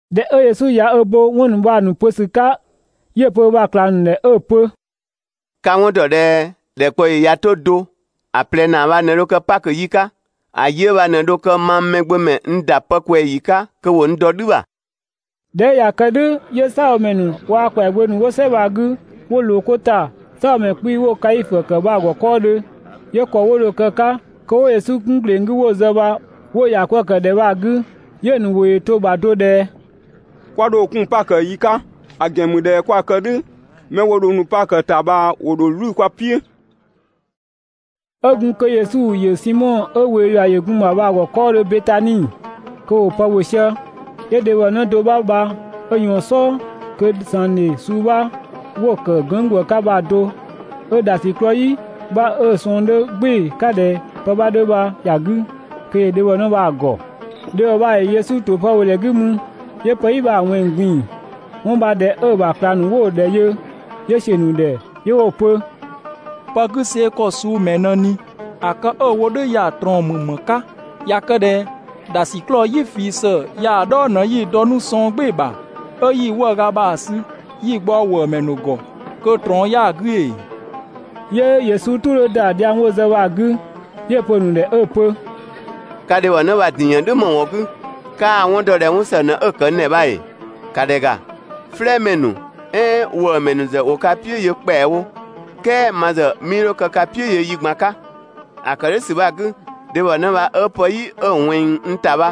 ꞊Dhɛ 'ö Yesu ꞊ya ö bo 'wɔn ‑nu bha‑ ‑nu pö ‑sü 'ka, 'yö‑ pö ö ‑bha ꞊klang ‑nu ‑dhɛ 'ö‑ pö: «Ka‑ 'wɔn ‑dɔ ꞊dhɛ ‑dhɛkpaɔyi ꞊ya 'to do ‑a ꞊plɛ ‑naa bha ꞊në dho kë Pakö yi 'ka, ‑a yi 'ö bha ꞊në dho kë mang Mɛgbömɛ n ‑da pë ꞊kwɛɛ‑ ‑yi 'ka kö ‑wo n ‑dɔ "dhü ‑bha.» ꞊Dhɛ 'ö ꞊ya kë "dhʋ̈ 'yö "saabhomɛ ‑nu waa‑ ‑kwɛagbö ‑nu 'wo "sɛ bha‑ 'gü, 'wo ꞊loo 'ko ‑ta "saabhomɛ 'kpii‑ 'wo‑ Kaifö ‑kë bha‑ ‑gɔ 'kɔɔdhö. 'Yö ‑kɔ 'wo dho‑ kë‑ ‑bha kö 'wo Yesu 'kun ‑gleng 'gü 'wo‑ zë bha 'wo‑ ‑ya 'kwëë‑ ‑kë ‑dhɛ bha‑ 'gü, 'yö‑ ‑nu ‑wʋ ‑yö to‑ bha do ꞊dhɛ: «'Kwa 'dho‑ 'kun Pakö yi 'ka, ‑a ‑gɛn ‑mü ꞊dhɛ 'kwa‑ kë "dhʋ̈ mɛ 'wo dho nu Pakö ‑ta bha ‑wo ‑dho "wlü kwa "piʋ̈.» 'Ö gun kö Yesu ‑yö Simɔ 'ö ꞊wee ‑yua ‑yö gun‑ ‑bha bha‑ ‑gɔ 'kɔɔdhö Betani, kö ‑wo pë ‑bhö sië, 'yö dhebhɔ 'në do 'bha bha 'ö ꞊yɔɔn‑ "sɔɔ kö ‑sangdhe suu 'bha 'wo‑ ‑kë gënng' ‑gwë 'ka bha‑ do 'ö ‑dhasiklɔɔ "yi 'bha 'ö‑ sɔɔn 'dhö "gbɩɩ‑ 'ka ꞊dhɛ pë 'bha 'dhö bha ‑ya 'gü, kö ‑yö dhebhɔ bha‑ ‑gɔ. Dhebhɔ bha ‑yö Yesu ‑to pë ‑bhö ‑dhɛ 'gü mü, 'yö pë "yi bha‑ ꞊wɛnng‑ ꞊gbin‑. 'Wɔn bha ꞊dhɛ 'ö‑ ‑bha ꞊klang ‑nu 'wo‑ ‑dhɛ yö, 'yö ‑siö ‑nu ‑dhɛ 'yö 'wo‑ pö: «Pë 'gü see‑ ‑kɔ suu ‑mɛɛ ꞊në ꞊ni? ‑A kë 'ö‑ wo "dhʋ̈ ya‑ ꞊trɔɔn ‑mü ‑më 'ka? ꞊Ya kë ꞊dhɛ ‑dhasiklɔɔ "yi ꞊fii ‑së ya‑ "dhɔɔ ꞊në 'yi‑ dɔ 'nu sɔng "gbɩɩ‑ bha, 'ö yi‑ 'wëëga bha‑ sü 'yi‑ ꞊gbaɔ ‑wëëmɛ ‑nu ‑gɔ kö ꞊trɔɔn 'yaa‑ 'gü ‑ee!» 'Yö Yesu "tʋ 'dhö ‑da dhiang 'wo‑ zë bha‑ 'gü 'yö‑ pö‑ ‑nu ‑dhɛ 'ö‑ pö: «Ka dhebhɔnë bha‑ ‑din ‑yën "dhʋ̈ ‑më ‑wɔn 'gü? 'Kaa‑ 'wɔn dɔ ꞊dhɛ 'wɔn ‑së ꞊në 'ö‑ kë n ‑dhɛ bha ‑ee? ‑Ka ‑dhɛ ‑ga, "flɛɛmɛ ‑nu, "ɛɛn ‑wëëmɛ ‑nu ‑zë ‑wo ka "piʋ̈ yö ‑kpɛawo, "kɛɛ ma ‑zë 'mii 'dho kë ka "piʋ̈ yö yi ꞊gban 'ka. ‑A ‑kë "dhʋ̈ ‑sü bha‑ 'gü, dhebhɔnë bha 'ö pë "yi 'ö‑ ꞊wɛnng n ‑ta bha,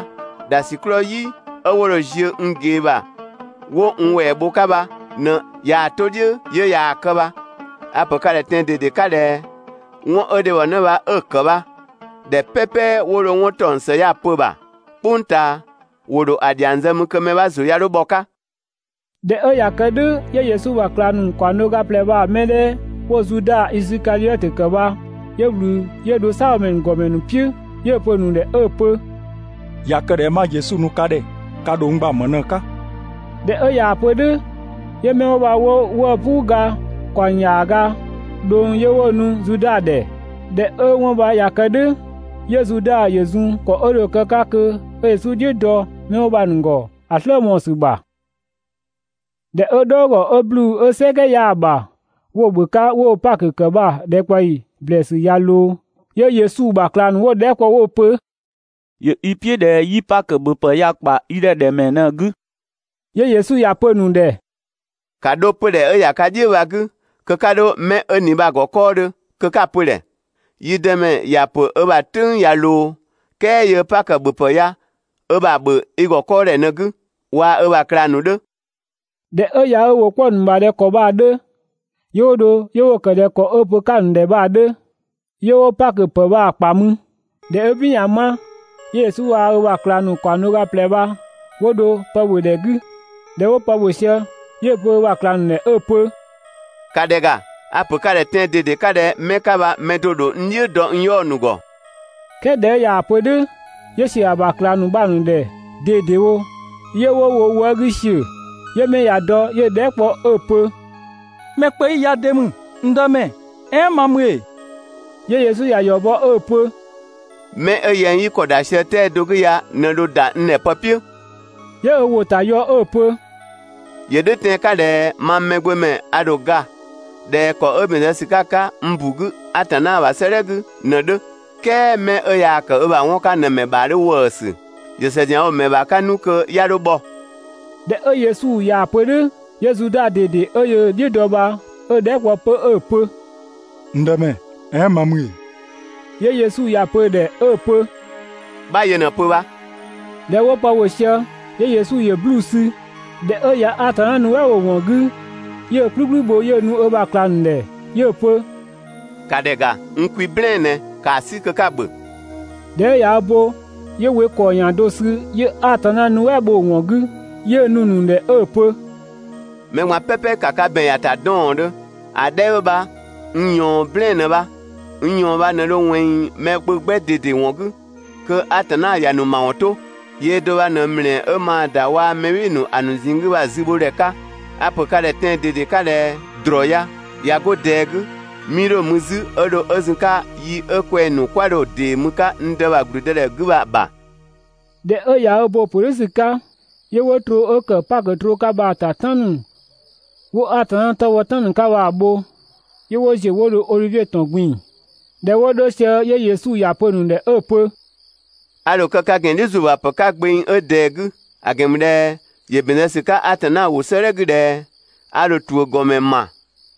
dhasiklɔɔ "yi 'ö 'wo dho‑ ziö n ꞊gee ‑bha 'wo n ‑wɛɛ bho‑ 'ka bha ꞊në ꞊yaa‑ 'to "dhiʋ̈ 'yö yaa‑ kë bha. A‑ pö ka ‑dhɛ tɛan‑ ꞊dede 'ka ꞊dhɛ: 'Wɔn 'ö dhebhɔnë bha 'ö‑ ‑kë bha, ‑dhɛ "pɛpɛ 'wo dho 'wɔn ‑taɔng ‑së ya‑ pö‑ ‑bha "kpʋng ꞊taa, ‑wo ‑dho ‑a ‑dhiang zë mü kö mɛ 'bha ‑zʋ 'ya 'dho bhɔ‑ 'ka.» ꞊Dhɛ 'ö ꞊ya kë "dhʋ̈ 'yö Yesu ‑bha ꞊klang ‑nu ‑kaɔng do ga ꞊plɛ bha‑ mɛ 'dhɛ 'wo‑ ‑dhɛ Zuda Isikadhiɔtö bha 'yö ꞊wlü 'yö dho "saabhomɛ ‑nu ‑gɔmɛ ‑nu "piʋ̈, 'yö‑ pö‑ ‑nu ‑dhɛ 'ö‑ pö: «꞊Ya kë ꞊dhɛ 'ma Yesu nu ka ‑dhɛ, ka ‑dho n gba ‑më ꞊në‑ 'ka?» ꞊Dhɛ 'ö ꞊yaa‑ pö "dhʋ̈, 'yö 'mɛ 'wo bha 'wo 'wëë‑ "puu ga ‑kaɔng ‑yaaga ꞊dhʋng 'yö 'wo‑ nu Zuda ‑dhɛ. ꞊Dhɛ 'ö 'wɔn bha ꞊ya kë "dhʋ̈, 'yö Zuda ‑yö zun ‑kɔ 'ö dho‑ kë 'ka kö 'ö Yesu "dhiʋ̈ dɔ 'mɛ bha‑ ‑nu ‑gɔ ‑a "slë mɔɔ‑ ‑sü ‑bha. ꞊Dhɛ 'ö "dhɔɔgɔ 'ö 'bluu‑ 'ö "sɛkɛ 'yaa‑ ‑bha 'wo‑ ‑bhö 'ka 'wo‑ Pakö ‑kë bha‑ ‑dhɛkpaɔyi ‑blɛɛsü ꞊ya ꞊loo, 'yö Yesu ‑bha ꞊klang ‑nu 'wo‑ dhɛɛ" kpɔ 'wo‑ pö: «‑Yö i "piʋ̈ ꞊dhɛ 'yi Pakö ‑bhöpë ya‑ ‑kpa i ‑dhɛ ‑dhɛ ‑mɛɛ ꞊në‑ 'gü?» 'Yö Yesu ‑ya pö‑ ‑nu ‑dhɛ: «‑Ka 'dho 'pödhɛ 'ö ‑ya ka "dhiʋ̈ bha‑ 'gü kö'ka 'dho 'mɛ 'ö ꞊ni bha‑ ‑gɔ 'kɔɔdhö kö 'ka‑ pö‑ ‑dhɛ: «Yi Dëmɛ ‑ya ‑pö ö ‑bha "tʋ̈ng ꞊ya ꞊loo, "kɛɛ yöö Pakö ‑bhöpë ya ö ‑bha ‑bhö i ‑gɔ 'kɔɔdhɛ ꞊në‑ 'gü waa‑ ö bha ꞊klang ‑nu 'dhö.» ꞊Dhɛ 'ö ꞊ya ö ‑wʋ 'kpɔ‑ ‑nu ‑bha ‑dhɛ ‑kɔ bha‑ 'dhö, 'yö 'wo dho 'wo‑ ‑kë ꞊dhɛ ‑kɔ 'ö‑ pö‑ 'ka‑ ‑nu ‑dhɛ bha‑ 'dhö, 'yö 'wo Pakö ‑pë bha‑ ‑kpa mü. ꞊Dhɛ 'ö "bin ꞊ya 'ma, 'yö Yesu waa‑ ö ‑bha ꞊klang ‑nu ‑kaɔng do ga ꞊plɛ bha 'wo dho pë ‑bhö ‑dhɛ 'gü. ꞊Dhɛ 'wo pë ‑bhö sië 'yö‑ pö ö ‑bha ꞊klang ‑nu ‑dhɛ 'ö‑ pö: «‑Ka ‑dhɛ ‑ga! A‑ ‑pö ka ‑dhɛ tɛan‑ ꞊dede 'ka ꞊dhɛ 'mɛ 'ka bha mɛ do‑ dho n "dhiʋ̈ dɔ n 'yaɔ‑ ‑nu ‑gɔ. "Kɛɛ ꞊dhɛ 'ö ꞊yaa‑ pö "dhʋ̈ 'yö ‑siö ‑a ‑bha ꞊klang ‑nu bha‑ ‑nu ‑dhɛ ꞊dedewo 'yö 'wo wo wë 'gü ‑siö, 'yö 'mɛ ꞊ya dɔ 'yö‑ dhɛɛ" kpɔ 'ö‑ pö: «Mɛ kpö 'yi ya de ‑mü, n Dëmɛ? "Ɛɛn ma ‑mü ‑ee? 'Yö Yesu ‑ya ‑yɔ bɔ 'ö‑ pö: «'Mɛ 'ö yɛng 'yi yi ‑kɔ ‑da sië 'tɛa‑ 'gü ya ꞊në dho ‑da n ‑dhɛ pë "piʋ̈.» 'Yö ö ‑wʋ ‑ta ‑yɔ 'ö‑ pö: «‑Yö "dhʋ̈ tɛan‑ 'ka ꞊dhɛ mang Mɛgbömɛ a ‑dho ga ꞊dhɛ ‑kɔ 'ö ‑bɛn zë ‑sü 'ka‑ 'ka n ‑bu 'gü Atanna ‑bha 'sëëdhɛ 'gü ꞊në‑ 'dhö, "kɛɛ 'mɛ 'ö yaa‑ ‑kë ö ‑bha 'wɔn 'ka ꞊në‑ ‑mɛ ‑bha 'dhö ‑wëësü. ‑Yö ‑së ‑zianwo ‑mɛ ‑bha 'ka 'nu kö 'ya 'dho bhɔ.» ꞊Dhɛ 'ö Yesu ꞊yaa‑ pö "dhʋ̈, 'yö Zuda ꞊dede 'ö yöö‑ "dhiʋ̈ dɔ bha 'ö‑ dhɛɛ" kpɔ 'pö 'ö‑ pö: «N Dëmɛ, "ɛɛn ma ‑mü ‑ee?» 'Yö Yesu ‑ya pö‑ ‑dhɛ 'ö‑ pö: «'Bha yö ꞊në‑ pö bha.» ꞊Dhɛ 'wo pë ‑bhö sië 'yö Yesu ‑yö 'bluu‑ sü. ꞊Dhɛ 'ö ꞊ya Atanna nuɛ" bho‑ ‑wɔn 'gü, 'yö‑ "kplükplü bho 'yö‑ nu ö ‑bha ꞊klang ‑nu ‑dhɛ 'yö‑ pö: «‑Ka ‑dhɛ ‑ga, n kwi "blɛɛn‑ ꞊nɛ. ‑Kaa 'sü kö 'ka‑ ‑bhö.» ꞊Dhɛ 'ö ꞊ya ö bo 'yö we ‑kɔɔ ‑yan do sü 'yö Atanna nuɛ" bho‑ ‑wɔn 'gü, 'yö‑ nu‑ ‑nu ‑dhɛ 'ö‑ pö: «Mɛ ꞊gban "pɛpɛ ‑ka ka ‑bɛn ‑ya ‑ta 'dɔɔndhö, ‑a 'dhɛ 'ö bha n ꞊yɔɔn "blɛɛn‑ ꞊në bha. N ꞊yɔɔn bha ꞊në dho ꞊wɛnng mɛ kpö 'gbɛ ꞊dede ‑wɔn 'gü, kö Atanna ‑ya ‑nu ‑mawɔn 'to. Yöö do bha ꞊në ‑mlɛɛ 'ö maa‑ ‑da waa‑ mɛ "bhɩɩ‑ ‑nu ‑a ‑nu ꞊zinng 'gü bha‑ zü ‑bho ‑dhɛ 'ka. A‑ ‑pö ka ‑dhɛ tɛan‑ ꞊dede 'ka ꞊dhɛ: «‑Drɔɔ ya, ꞊ya 'go ꞊dɛɛ 'gü, 'mii 'dho‑ mü 'zü 'ö dho 'ö zun‑ 'ka yi 'ö kwɛng‑ ‑nu 'kwa dho‑ ‑dee mü‑ 'ka n Dë ‑bha ‑gblüdëdhɛ 'gü bha‑ ‑bha.» ꞊Dhɛ 'ö ꞊ya ö bo‑ ‑pö "dhʋ̈ ‑sü 'ka, 'yö 'wo troo 'ö kë Pakö troo 'ka bha‑ ‑ta "tan ‑nu 'wo Atanna 'tɔ bhɔ "tan ‑nu 'ka bha‑ bho, 'yö 'wo ‑ziö 'wo dho Odhivie ‑tɔn ꞊gbin‑. ꞊Dhɛ 'wo 'dho sië 'yö Yesu ‑ya pö‑ ‑nu ‑dhɛ 'ö‑ pö: «A ‑dho kë ka ‑gɛn "dhiʋ̈ ‑zuö ‑bha ‑pë 'ka gbeng do 'ö ꞊dɛɛ‑ 'gü. ‑A ‑gɛn ‑mü ꞊dhɛ ‑yö ‑bɛn zë ‑sü 'ka Atanna ‑wʋ 'sëëdhɛ 'gü ꞊dhɛ: ‹A ‑dho ‑tuʋ̈ ‑gɔdhiʋ̈mɛ ‑ma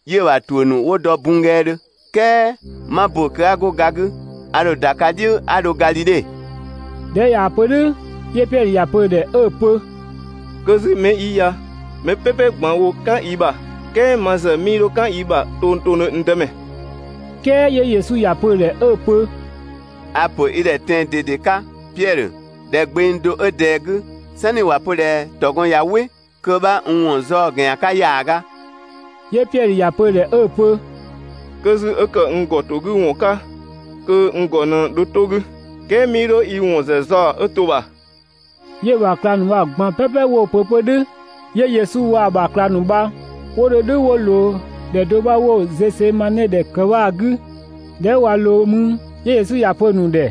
'yö‑ ‑bha ‑tuʋ̈ ‑nu 'wo dɔ bunnggɛɛdhö.› "Kɛɛ 'ma ‑bö kö 'a 'go ga 'gü, a ‑dho ‑da ka "dhiʋ̈ 'a dho Gadhidhe.» ꞊Dhɛ 'ö ꞊yaa‑ pö "dhʋ̈ 'yö Piɛdhö ‑ya pö‑ ‑dhɛ 'ö‑ pö: «'Kö 'zü 'mɛ 'yi ya mɛ "pɛpɛ ꞊gban woo "kan i ‑bha, "kɛɛ ma ‑zë 'mii 'dho "kan i ‑bha tongtongdhö, n Dëmɛ.» "Kɛɛ 'yö Yesu ‑ya pö‑ ‑dhɛ 'ö‑ pö: «A‑ ‑pö i ‑dhɛ tɛan‑ ꞊dede 'ka, Piɛdhö, ꞊dhɛ gbeng do 'ö ꞊dɛɛ‑ 'gü, "sanni ‑wa pö ꞊dhɛ ‑tɔgɔn ꞊ya "wɩ kö 'bha n ‑wɔn zaɔ‑ ‑gɛn ‑yan 'ka ‑yaaga.» 'Yö Piɛdhö ‑ya pö‑ ‑dhɛ 'ö‑ pö: «'Kö 'zü 'ö ‑kë n ‑gɔ ‑to 'gü ‑wɔn 'ka, kö n ‑gɔ ꞊në dho 'to‑ 'gü, "kɛɛ 'mii 'dho i ‑wɔn ‑zë zaɔ‑ 'ö to‑ ‑bha. 'Yö‑ ‑bha ꞊klang ‑nu bha‑ ꞊gban "pɛpɛ 'wo‑ pö 'pö "dhʋ̈. 'Yö Yesu waa‑ ‑bha ꞊klang ‑nu bha 'wo dho "dhʋ̈ 'wo ꞊loo ‑dhɛ do 'bha 'wo‑ Zɛsemane ‑dhɛ ‑kë bha‑ 'gü. ꞊Dhɛ 'ö ꞊wa ꞊loo mü 'yö Yesu ‑ya pö‑ ‑nu ‑dhɛ: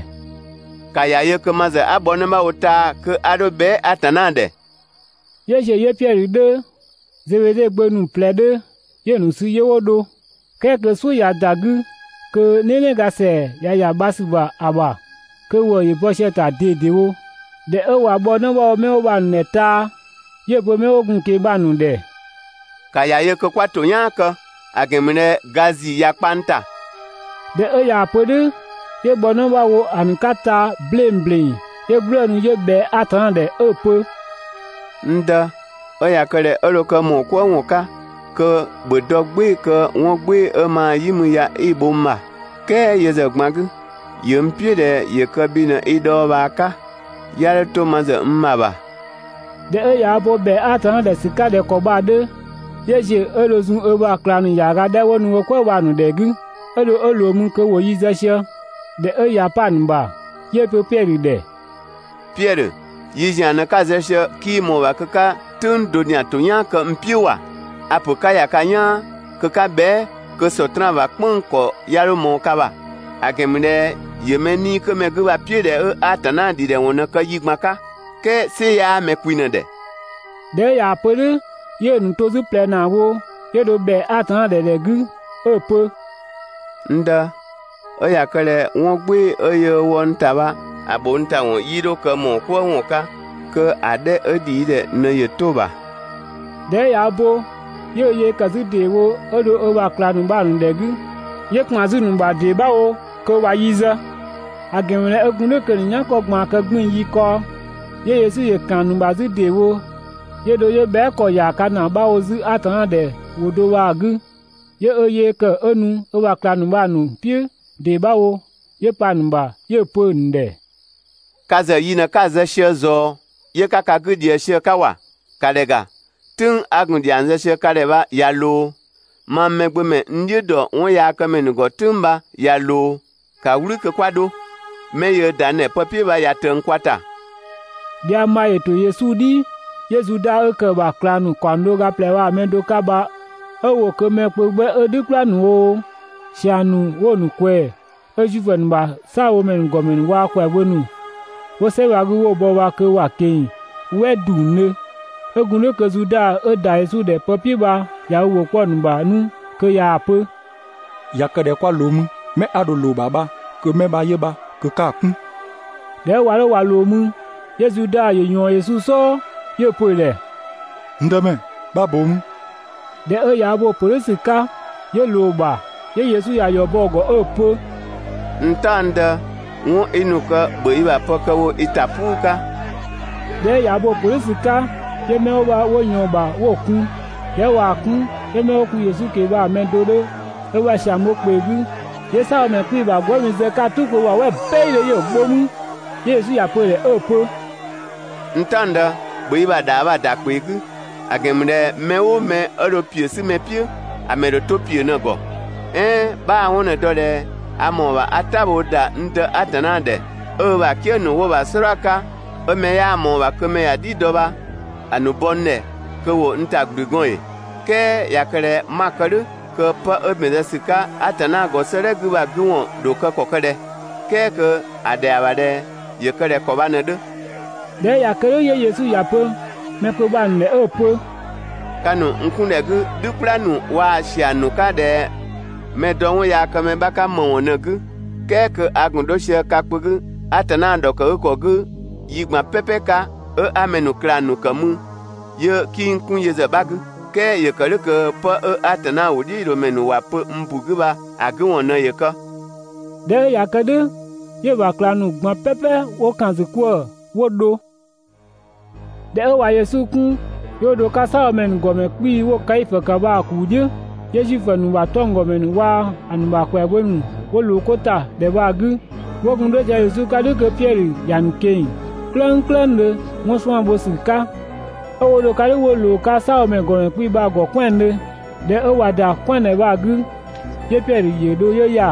«‑Ka ‑ya yö kö ma ‑zë 'a bhɔ 'në 'bha wo taa‑ kö 'a 'dho bhɛa" Atanna ‑dhɛ.» 'Yö ‑ziö 'yö Piɛdhö 'dhö, Zebede gbö ‑nu ꞊plɛ 'dhö, 'yö‑ ‑nu sü 'yö 'wo dho, "kɛɛ kö "suʋ̈ ꞊ya ‑da 'gü, kö "nɛnɛga ‑sɛa ꞊ya ‑ya bha ‑sü ‑bha ‑a ‑bha, kö ‑wëë ‑yö bɔ sië‑ ‑ta ꞊dedewo. ꞊Dhɛ 'ö ꞊wa bhɔ 'në 'bha wo 'mɛ 'wo bha‑ ‑nu ‑dhɛ taa‑, 'yö‑ pö 'mɛ 'wo gun‑ ꞊keng‑ bha‑ ‑nu ‑dhɛ: «‑Ka ‑ya yö kö 'kwa ‑toyaan kë, ‑a ‑gɛn ‑mü ꞊dhɛ ga ‑zii ꞊ya kpa n ‑ta.» ꞊Dhɛ 'ö ꞊yaa‑ pö "dhʋ̈ 'yö bhɔ 'në 'bha wo ‑a ‑nu 'ka taa‑ 'bleng ‑bleng, 'yö "gblëënu 'yö ꞊bhɛa Atanna ‑dhɛ 'ö‑ pö: «N Dë, 'ö ꞊ya kë ꞊dhɛ 'ö dho kë ‑mɔɔ "kwëë ‑wɔn 'ka kö ‑bhö dɔ "gbɩɩ‑ kö 'wɔn "gbɩɩ‑ 'ö maa‑ "yi mü ya 'i‑ bho n ‑bha, "kɛɛ yö ‑zë ꞊gban 'gü, ‑yö n "piʋ̈ ꞊dhɛ ‑yö kë bhi ꞊në i dhɔɔbhaa 'ka 'ya 'dho 'to ma ‑zë n ‑bha ‑bha.» ꞊Dhɛ ꞊ya ö bo ‑bhɛa Atanna ‑dhɛ ‑sü 'ka ꞊dhɛ ‑kɔ bha‑ 'dhö, 'yö ‑ziö 'ö dho zun ö ‑bha ꞊klang ‑nu ‑yaaga 'dhɛ 'wo nu "kwëë bha‑ ‑nu ‑dhɛ 'gü, 'ö dho 'ö ꞊loo mü kö ‑wo yi zë sië (꞊dhɛ 'ö ꞊ya 'pa‑ ‑nu ‑bha). 'Yö‑ pö Piɛdhö ‑dhɛ: «Piɛdhö, yi ‑zian ꞊në‑ 'ka‑ zë sië, 'kii ꞊mɔɔ‑ ‑bha kö 'ka "tʋ̈ng do ‑zian ‑to "yaan kë n "piʋ̈ ‑wa? A‑ ‑pö 'ka ‑ya ka "yaan kö 'ka bhɛa" kö Sɔtraan ‑bha "kpënng‑ ‑kɔ 'ya 'dho ꞊mɔɔ ka ‑bha, ‑a ‑gɛn ‑mü ꞊dhɛ ‑yö mɛ 'nii‑ 'kö mɛ 'gü bha‑ "piʋ̈ ꞊dhɛ 'ö Atanna ‑dhidhɛwɔn ꞊në kë yi ꞊gban 'ka, "kɛɛ "sɩ 'yaa mɛ kwi ꞊në‑ ‑dhɛ.» ꞊Dhɛ 'ö ꞊yaa‑ pö "dhʋ̈ 'yö‑ ‑nu to 'zü ꞊plɛ ‑naa wo, 'yö dho ‑bhɛa Atanna ‑dhɛ ‑dhɛ 'gü 'ö‑ pö: «N Dë, 'ö ꞊ya kë ꞊dhɛ 'wɔn "gbɩɩ‑ 'ö yöö wɔ n ‑ta bha, ‑a ‑bho n ‑ta ‑wɔn 'yii 'dho kë ‑mɔɔ "kwëë ‑wɔn 'ka kö ‑a 'dhɛ 'ö ‑dhi i ‑dhɛ ꞊në ‑yö 'to‑ ‑bha.» ꞊Dhɛ 'ö ꞊ya ö bo, 'yö ö yee ‑kë 'zü ‑deewo 'ö dho ö ‑bha ꞊klang ‑nu bha‑ ‑nu ‑dhɛ 'gü, 'yö ‑kpan 'zü‑ ‑nu ‑bha ‑dee 'bha wo kö ꞊wa yi zë, ‑a ‑gɛn ‑mü ꞊dhɛ 'ö gun "dhʋ̈ kö‑ ‑nu "yankɔ ꞊gbaan kë 'gbiin‑ yi kaɔ. 'Yö Yesu ‑yö ‑kan 'zü‑ ‑nu ‑bha ‑deewo 'yö dho 'yö bhɛa" ‑kɔ ‑yaaga ‑naa 'bha wo 'zü Atanna ‑dhɛ ‑wʋ do bha‑ 'gü. 'Yö ö yee ‑kë 'ö nu ö ‑bha ꞊klang ‑nu bha‑ ‑nu "piʋ̈ ‑dee 'bha wo ('yö pa‑ ‑nu ‑bha) 'yö‑ pö‑ ‑nu ‑dhɛ: «Ka ‑zë yi ꞊në 'ka zë sië ꞊zɔɔ 'yö 'ka ka 'gü ꞊dhië sië‑ 'ka ‑wa! ‑Ka ‑dhɛ ‑ga, "tʋ̈ng 'a gun‑ ‑dhiang zë sië ka ‑dhɛ bha ꞊ya ꞊loo, mang Mɛgbömɛ n "dhiʋ̈ ‑dɔ 'wɔnyaakëmɛ ‑nu ‑gɔ "tʋ̈ng bha ꞊ya ꞊loo. ‑Ka "wlü kö 'kwa 'dho! 'Mɛ yöö ‑da n ‑dhɛ pë "piʋ̈ bha ꞊ya ꞊tëng kwa ‑ta.» Dhiang bha ‑yö ‑to Yesu "dhi 'yö Zuda 'ö ‑kë ‑bha ꞊klang ‑nu ‑kaɔng do ga ꞊plɛ bha‑ mɛ do 'ka bha 'ö ‑wo kö mɛ kpö 'gbɛ 'ö "dhü "kpla ‑nu oo, ‑siang ‑nu 'wo‑ ‑nu ꞊kwɛɛ‑ 'ö Zuifö ‑nu ‑bha "saabhomɛ ‑nu ‑gɔmɛ ‑nu waa‑ ‑kwɛagbö ‑nu 'wo "sɛ bha‑ 'gü 'wo‑ ‑nu bɔ bha kö ‑wa ꞊keng‑ "wɛ ‑dungdhö. 'Ö gun "dhʋ̈ kö Zuda 'ö ‑da Yesu ‑dhɛ pë "piʋ̈ bha ꞊ya ö ‑wʋ 'kpɔ‑ ‑nu ‑bha 'nu kö ꞊yaa‑ pö: «꞊Ya kë ꞊dhɛ 'kwa ꞊loo mü, 'mɛ 'a dho‑ ꞊loo‑ ‑bha bha kö 'mɛ bha 'yö bha, kö 'ka‑ 'kun.» ꞊Dhɛ 'ö ꞊wa 'dho ꞊wa ꞊loo mü 'yö Zuda ‑yö ‑yɔɔn Yesu "sɔɔ 'yö‑ pö‑ ‑dhɛ: «N Dëmɛ, 'bha ꞊boo mü!» ꞊Dhɛ 'ö ꞊ya ö bo‑ ‑pö "dhʋ̈ ‑sü 'ka, 'yö ꞊loo‑ ‑bha. 'Yö Yesu ‑ya ‑yɔ bɔ‑ ‑gɔ 'ö‑ pö: «N "taɔngdë, 'wɔn 'i nu‑ kë ‑bhö i bha pë kë wo i ‑ta "puu 'ka!» ꞊Dhɛ 'ö ꞊ya ö bo‑ ‑pö "dhʋ̈ ‑sü 'ka 'yö 'mɛ 'wo bha 'wo ꞊yɔɔn‑ ‑bha 'yö 'wo‑ kun. ꞊Dhɛ 'ö ꞊waa‑ 'kun 'yö 'mɛ 'wo gun Yesu ꞊keng‑ bha‑ mɛ do 'dhö ö ‑bha ‑siang bho ö ‑kpee 'gü, 'yö "saabhomɛ 'kpii‑ ‑bha gwëëmi zë‑ 'ka‑ "tʋ kpö ‑bha "wɛ "bɛidhö 'yö‑ bho mü. 'Yö Yesu ‑ya pö‑ ‑dhɛ 'ö‑ pö: «N "taɔngdë, ‑bhö i ‑bha ‑dhaa bha‑ ‑da ‑kpee 'gü, ‑a ‑gɛn ‑mü ꞊dhɛ mɛ "ʋʋ mɛ 'ö dho ‑piö 'si mɛ "piʋ̈, ‑a ‑mɛ ‑dho 'to ‑piö ꞊në‑ ‑gɔ. "Ɛɛn 'bhaa‑ 'wɔn ꞊në‑ dɔ ꞊dhɛ a ‑mɔɔ ‑bha 'a "tabhoo ‑da n Dë Atanna ‑dhɛ 'ö ö ‑bha "kië ‑nu 'wo‑ ‑bha "sɔdha 'ka 'ö mɛ 'yaa ꞊mɔɔ‑ ‑bha kö mɛ ‑ya a "dhi dɔ bha‑ ‑nu bɔ n ‑dhɛ kö 'wo n ‑ta ‑gblü gɔɔn ‑ee? "Kɛɛ ꞊ya kë ꞊dhɛ 'ma‑ kë "dhʋ̈ kö 'pë 'ö ‑bɛn zë ‑sü 'ka Atanna ‑gɔ 'sëëdhɛ 'gü bha‑ 'gü ‑wɔn ‑dho kë ‑kɔ ‑kë ꞊dhɛ "kɛɛ kö‑ ‑dhɛa ‑bha ꞊dhɛ ‑yö kë ꞊dhɛ ‑kɔ bha ꞊në‑ 'dhö?» ꞊Dhɛ 'ö ꞊ya kë "dhʋ̈ 'yö Yesu ‑ya pö mɛ kpö bha‑ ‑nu ‑dhɛ 'ö‑ pö: «Ka ‑nu n 'kun ‑dhɛ 'gü "dhü "kpla ‑nu waa‑ ‑siang ‑nu 'ka ꞊dhɛ mɛ‑ dɔ 'wɔnyaakëmɛ 'bha 'ka ‑më ‑wɔn ꞊në‑ 'gü "kɛɛ kö a ‑gun 'dho sië ka kpö 'gü Atanna ‑dhɔkëgükɔ 'gü yi ꞊gban "pɛpɛ 'ka 'ö 'a mɛ ‑nu ꞊klang ‑nu kë mü 'yö 'kii n 'kun yö ‑zë 'bha 'gü! "Kɛɛ ‑yö ‑kë "dhʋ̈ kö 'pë 'ö Atanna ‑wʋdhiʋ̈loomɛ ‑nu ‑wa pö n ‑bu 'gü bha‑ 'gü ‑wɔn ꞊në ‑yö kë. ꞊Dhɛ 'ö ꞊ya kë "dhʋ̈, 'yö‑ ‑bha ꞊klang ‑nu ꞊gban "pɛpɛ 'wo ‑kan ‑zü 'kwëë‑ 'wo dho. ꞊Dhɛ 'ö ꞊wa Yesu 'kun, 'yö 'wo dho‑ 'ka "saabhomɛ ‑nu ‑gɔmɛ 'kpii‑ 'wo‑ Kaifö ‑kë bha‑ ‑kuu "dhiʋ̈, 'yö Zuifö ‑nu ‑bha 'tɔnggɔmɛ ‑nu waa‑ ‑nu ‑bha ‑kwɛagbö ‑nu 'wo ꞊loo 'ko ‑ta ‑dhɛ bha‑ 'gü. 'Wo gun 'dho sië Yesu 'ka "dhʋ̈ kö Piɛdhö ‑ya ꞊keng‑ "klëngklëngdhö 'wɔn 'suan‑ bho ‑sü 'ka, 'ö 'wo dho‑ 'ka "dhʋ̈ 'wo ꞊loo‑ 'ka "saabhomɛ ‑gɔmɛ 'kpii‑ bha‑ ‑gɔ "kwɛandhö. ꞊Dhɛ 'ö ꞊wa ‑da "kwɛandhɛ bha‑ 'gü, 'yö Piɛdhö ‑yö dho 'yö ‑ya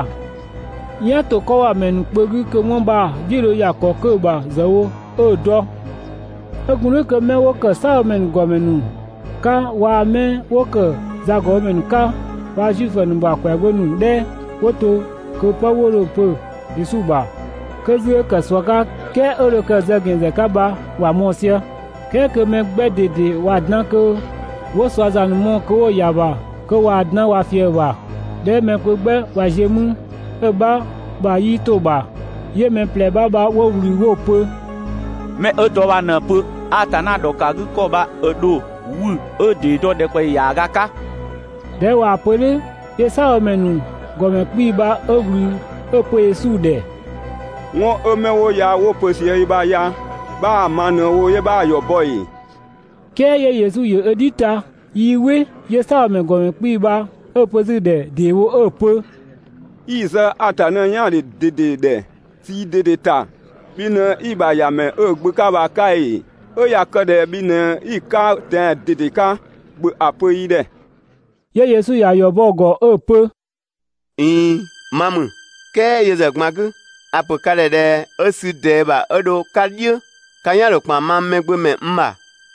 "yan ‑to 'kɔ ‑bha ‑mɛ ‑nu kpö 'gü kö 'wɔn bha‑ "dhiʋ̈‑ dho ‑ya ‑kɔ 'kö‑ ‑bha ‑zë wo 'ö‑ dɔ. 'Ö gun "dhʋ̈ kö 'mɛ 'wo ‑kë "saabhomɛ ‑nu ‑gɔmɛ ‑nu 'ka waa‑ 'mɛ 'wo ‑kë zagɔbhomɛ ‑nu 'ka waa‑ Zuifö ‑nu ‑bha ‑kwɛagbö ‑nu 'dhɛ 'wo to kö 'pë 'wo dho‑ pö Yesu ‑bha, 'kö 'zü 'ö ‑kë ꞊sua 'ka "kɛɛ 'ö dho kë‑ zë ‑gɛn ‑zë 'ka bha ‑wa mɔɔ‑ sië. "Kɛɛ kö mɛ 'gbɛ ꞊dede ꞊waa‑ dan kö 'wo ꞊sua ‑za ‑nu mɔɔ‑ kö 'wo‑ ‑ya ‑bha kö ꞊waa‑ dan ꞊wa ꞊fië‑ ‑bha. ꞊Dhɛ 'ö mɛ kpö 'gbɛ ꞊wa ziö mü, 'ö‑ 'bha ‑bha 'yii 'to‑ ‑bha, 'yö mɛ ꞊plɛ 'bha bha 'wo ꞊wlü 'wo‑ pö: «'Mɛ 'ö dɔ bha ꞊në‑ pö, Atanna ‑dhɔkëgükɔ bha ö ‑dho 'wü 'ö‑ ‑dee dɔ ‑dhɛkpaɔyi ‑yaaga 'ka.» ꞊Dhɛ 'ö ꞊waa‑ pö "dhʋ̈ 'yö "saabhomɛ ‑nu ‑gɔmɛ 'kpii‑ bha 'ö ꞊wlü 'ö‑ pö Yesu ‑dhɛ: «'Wɔn 'ö 'mɛ 'wo ya 'wo‑ pö sië i ‑bha ya, 'bhaa‑ ma ꞊në‑ wo 'yö 'bhaa‑ ‑yɔ bɔ ‑ee?» "Kɛɛ 'yö Yesu ‑yö ö "dhi ta 'yö 'yii "wɩ. 'Yö "saabhomɛ ‑nu ‑gɔmɛ 'kpii‑ bha 'ö‑ pö 'zü‑ ‑dhɛ ‑deewo 'ö‑ pö: «'I‑ ‑zë Atanna "yaandhe ꞊dede ‑dhɛ, ꞊sii ꞊dede ‑ta, bhi ꞊në 'i‑ ‑bha ‑Yamɛ 'ö‑ Gbö 'ka bha‑ 'ka ‑ee? 'Ö ꞊ya kë ꞊dhɛ bhi ꞊në 'i‑ 'ka tɛan‑ ꞊dede 'ka, ‑bhö ‑a pö yi ‑dhɛ!» 'Yö Yesu ‑ya ‑yɔ bɔ‑ ‑gɔ 'ö‑ pö: «꞊Iin, ma ‑mü, "kɛɛ yö ‑zë ꞊gban 'gü a‑ ‑pö ka ‑dhɛ ꞊dhɛ 'ö sü ꞊dɛɛ ‑bha 'ö dho‑ 'ka "dhiʋ̈ ka "yan‑ ‑dho ‑kpan mang Mɛgbömɛ n ‑bha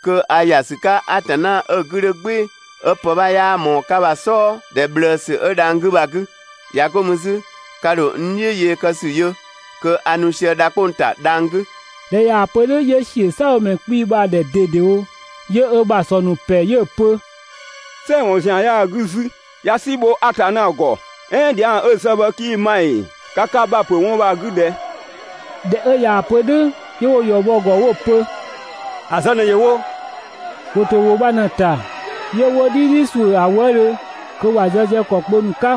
kö a ‑ya ‑sü 'ka Atanna 'ö‑ 'gü 'dhö "gbɩɩ‑ 'ö pë 'bha 'yaa ꞊mɔɔ‑ 'ka bha‑ "sɔɔ ‑dhɛ ꞊bhlëësü 'ö dhang‑ 'gü bha‑ 'gü. ꞊Ya 'go mü 'zü ka ‑dho n "dhiʋ̈ yee kë ‑sü yö kö a nu sië dha 'kpong‑ ‑ta dhang‑ 'gü.» ꞊Dhɛ ꞊yaa‑ pö "dhʋ̈ 'yö ‑siö "saabhomɛ 'kpii‑ bha‑ ‑dhɛ ꞊dedewo 'yö ö ‑bha ‑sɔ ‑nu ‑pɛ 'yö‑ pö: «"Sɛɛ‑ ‑wɔn ‑zian 'yaa‑ 'gü 'zü, ꞊ya "si bho Atanna ‑gɔ! "Ɛɛn dhiang 'ö‑ zë bha 'kii‑ ma ‑ee? Ka ka ‑bha ‑pö 'wɔn bha‑ 'gü ꞊dhɛ? ꞊Dhɛ 'ö ꞊yaa‑ pö "dhʋ̈, 'yö 'wo‑ ‑yɔ bɔ‑ ‑gɔ 'wo‑ pö: «‑A zë ꞊në ‑yö wo!» ‑Wo ‑to ‑wʋ bha ꞊në‑ ‑ta, 'yö 'wo "dhidhi ‑suʋ̈ ‑a wëëdhö kö ‑wa zë sië ‑kɔ kpö ‑nu 'ka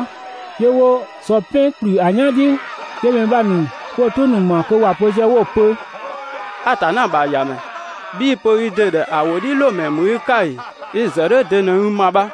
('yö 'wo sɔ "pɛn ‑kplü ‑a "yan "dhiʋ̈). 'yö mɛ bha ‑nu 'wo‑ "tʋ ‑nu ‑ma kö ‑wa pö sië 'wo‑ pö: «Atanna ‑bha ‑Yamɛ, (bhii‑ pö i ‑dɩ ‑dhɛ ‑a ‑wʋdhiʋ̈loomɛ ‑mü i 'ka ‑ee) i‑ ‑zë "dhʋ̈ de në i ‑ma bha?»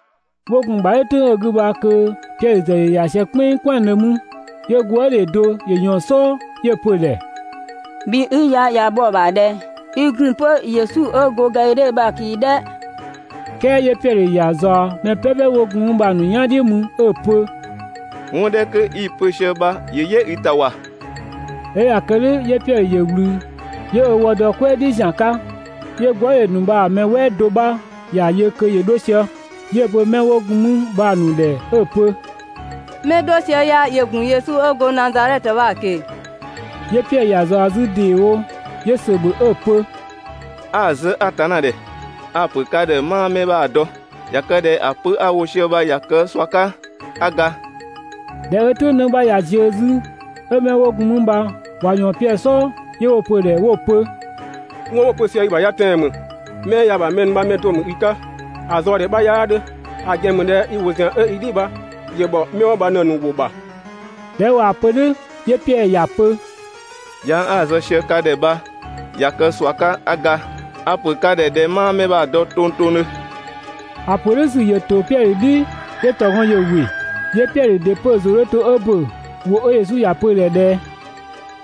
'Wo gun‑ ‑bha "dhʋ̈ "tʋ̈ng 'ö‑ 'gü bha kö Piɛdhö ‑zë ‑yö ‑ya sië "kpɛnng "kwɛandhö mü. 'Yö gwëëdhe do ‑yö ꞊yɔɔn‑ "sɔɔ 'yö‑ pö ꞊dhɛ: «Bhi 'i ya ꞊ya bhɔ‑ ‑bha ꞊dhɛ i ‑gun 'pö Yesu 'ö go Gadhidhe bha‑ ꞊keng‑ "dhɛ?» "Kɛɛ 'yö Piɛdhö ‑ya ꞊zaɔ mɛ "pɛpɛ 'wo gun mü bha‑ ‑nu "yan "dhiʋ̈ mü 'ö‑ pö: «'Wɔn 'dhɛ 'kö 'i‑ pö sië bha ‑yö "yɛ i ‑ta ‑wa.» ꞊Dhɛ 'ö ꞊ya kë "dhʋ̈ 'yö Piɛdhö ‑yö ꞊wlü 'yö ö wë dɔ "kwɛɛ "dhi ‑zian 'ka. 'Yö gwëëdhe ‑nu bha‑ mɛ "wɛɛ do 'bha ‑ya yö kö ‑yö 'dho sië 'yö‑ pö 'mɛ 'wo gun 'mü bha‑ ‑nu ‑dhɛ 'ö‑ pö: «'Mɛ 'ö 'dho sië ya ‑yö ‑gun 'pö Yesu 'ö go Nazadhɛtö bha‑ ꞊keng‑!» 'Yö Piɛdhö ‑ya ꞊zaɔ 'zü ‑deewo, 'yö ‑sö ‑bhö 'ö‑ pö: «('A‑ zë Atanna ‑dhɛ) a‑ ‑pö ka ‑dhɛ 'maa 'mɛ bha‑ dɔ! (꞊Ya kë ꞊dhɛ ‑a pö 'a‑ wo sië bha ꞊ya kë ꞊sua 'ka 'a ga).» ꞊Dhɛ 'ö "tʋ̈ng 'në 'bha ꞊ya ziö 'zü, 'ö 'mɛ 'wo gun mü bha ꞊wa ꞊yɔɔn Piɛdhö "sɔɔ 'yö 'wo‑ pö‑ ‑dhɛ 'wo‑ pö: «'Wɔn 'wo‑ pö sië i bha ya tɛan‑ ‑mü, 'mɛ 'ö ya‑ ‑bha mɛ ‑nu bha‑ mɛ do ‑mü i 'ka, ‑a zaɔ‑ ‑dhɛ 'bha 'yaa 'dhö, ‑a ‑gɛn ‑mü ꞊dhɛ i ‑wʋ ‑zian 'ö i "dhi bha ‑yö ‑bhɔ 'mɛ 'wo bha ꞊në‑ ‑nu ‑wʋ ‑bha.» ꞊Dhɛ 'ö ꞊waa‑ pö "dhʋ̈, 'yö Piɛdhö ‑ya pö: «Dhiang 'a‑ zë sië ka ‑dhɛ bha ꞊ya kë ꞊sua 'ka 'a ga. A‑ ‑pö ka ‑dhɛ ꞊dhɛ 'maa 'mɛ bha‑ dɔ tongtongdhö.» ‑A ‑pö "dhʋ̈ ‑sü ‑yö ‑to Piɛdhö "dhi 'yö ‑tɔgɔn ‑yö ‑wɩ. 'Yö Piɛdhö ‑dɩ 'pö‑ ‑zʋ 'dhö to 'ö ‑bö ‑wʋ 'ö Yesu ‑ya pö‑ ‑dhɛ ꞊dhɛ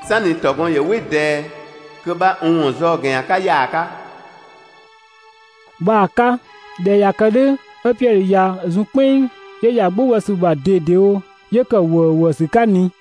‹"sanni ‑tɔgɔn ‑yö "wɩ ꞊dɛɛ kö 'bha n ‑wɔn zaɔ‑ ‑gɛn ‑yan 'ka ‑yaaga› bha‑ 'ka. ꞊Dhɛ 'ö ꞊ya kë "dhʋ̈ 'ö Piɛdhö ꞊ya zun "kpɛnng 'yö ‑ya "gbʋ bɔ ‑sü ‑bha ꞊dedewo 'yö ‑kë ‑wëëwëësü 'ka ꞊ni.